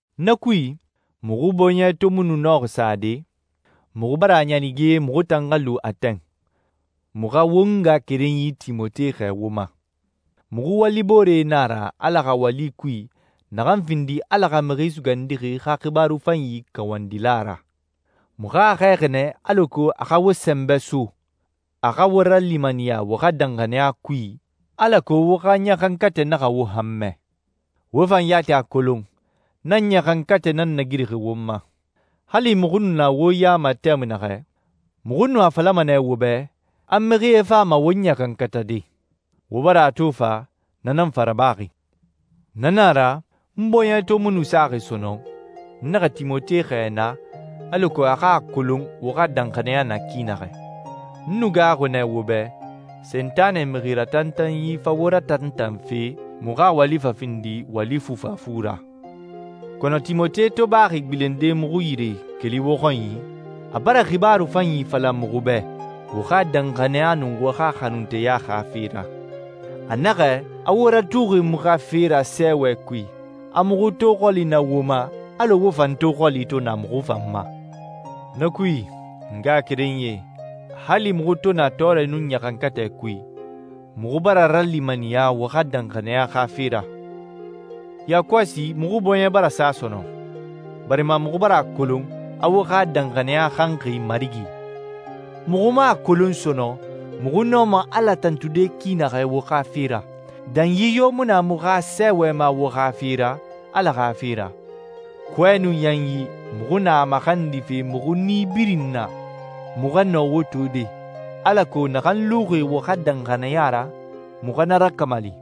Na kui, muxu bɔɲɛ to mu nɔxi sade, muxu bara a ɲanige muxu tan xa lu Atɛn, muxu xa won ngaxakerenyi Timote xɛɛ wo ma. Muxu waliboore na a ra Ala xa wali kui naxan findi Ala xa Mixi Sugandixi xa xibaaru fanyi kawandila ra. Muxu a xɛɛxi nɛ alako a xa wo sɛnbɛ so, a xa wo ralimaniya wo xa danxaniya kui, alako wo xa ɲaxankatɛ naxa wo hanmɛ. Wo fan yati a kolon, na ɲaxankatɛ nan nagirixi won ma. Hali muxu nu na wo ya ma tɛmui naxɛ, muxu nu a falama nɛ wo bɛ, a mixie fama won ɲaxankatade. Wo bara a to fa, na nan fa rabaxi. Na nan a ra, n bɔɲɛ to mu nu saxi sɔnɔn, n naxa Timote xɛɛ naa alako a xa a kolon wo xa danxaniya na ki naxɛ. N nu gaaxuxi nɛ wo bɛ Sentanɛ mixi ratantanyi fa wo ratantanfe, muxu xa wali fa findi wali fufafu ra. Kɔnɔ Timote to baxi gbilende muxu yire keli wo xɔnyi, a bara xibaaru fanyi fala muxu bɛ wo xa danxaniya nun wo xa xanunteya xa fe ra. A naxɛ, a wo ratuxi muxu xa fe ra sɛɛwɛ kui, a muxu to xɔli na wo ma, alɔ wo fan to xɔli to na muxu fan ma. Na kui, n ngaxakerenyie, hali muxu to na tɔɔrɛ nun ɲaxankatɛ kui, muxu bara ralimaniya wo xa danxaniya xa fe ra. Yakɔsi muxu bɔɲɛ bara sa sɔnɔn, barima muxu bara a kolon a wo xa danxaniya xanxi Marigi. Muxu mu a kolon sɔnɔn muxu nɔma Ala tantude ki naxɛ wo xa fe ra. Danyi yo mu na muxu xa sɛɛwɛ ma wo xa fe ra Ala xa fe ra. Kɔɛ nun yanyi muxu na a maxandife muxu nii birin na, muxu xa nɔ wo tode, alako naxan luxi wo xa danxaniya ra, muxu xa na rakamali.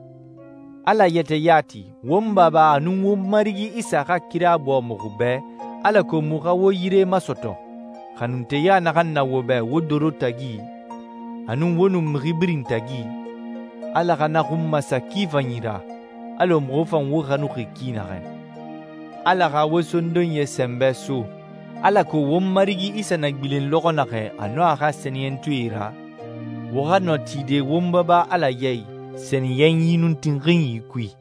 Ala yɛtɛ yati, won Baba, a nun won Marigi Isa xa kira bɔɔ muxu bɛ alako muxu xa wo yire masɔtɔ. Xanunteya naxan na wo bɛ wo doro tagi, a nun wo nun mixi birin tagi, Ala xa na xun masa ki fanyi ra, alɔ muxu fan wo xanuxi ki naxɛ. Ala xa wo sondonyie sɛnbɛ so alako won Marigi Isa na gbilen lɔxɔ naxɛ a nun a xa sɛniyɛntɔɛe ra, wo xa nɔ tide won Baba Ala ya i sɛniyɛnyi nun tinxinyi kui.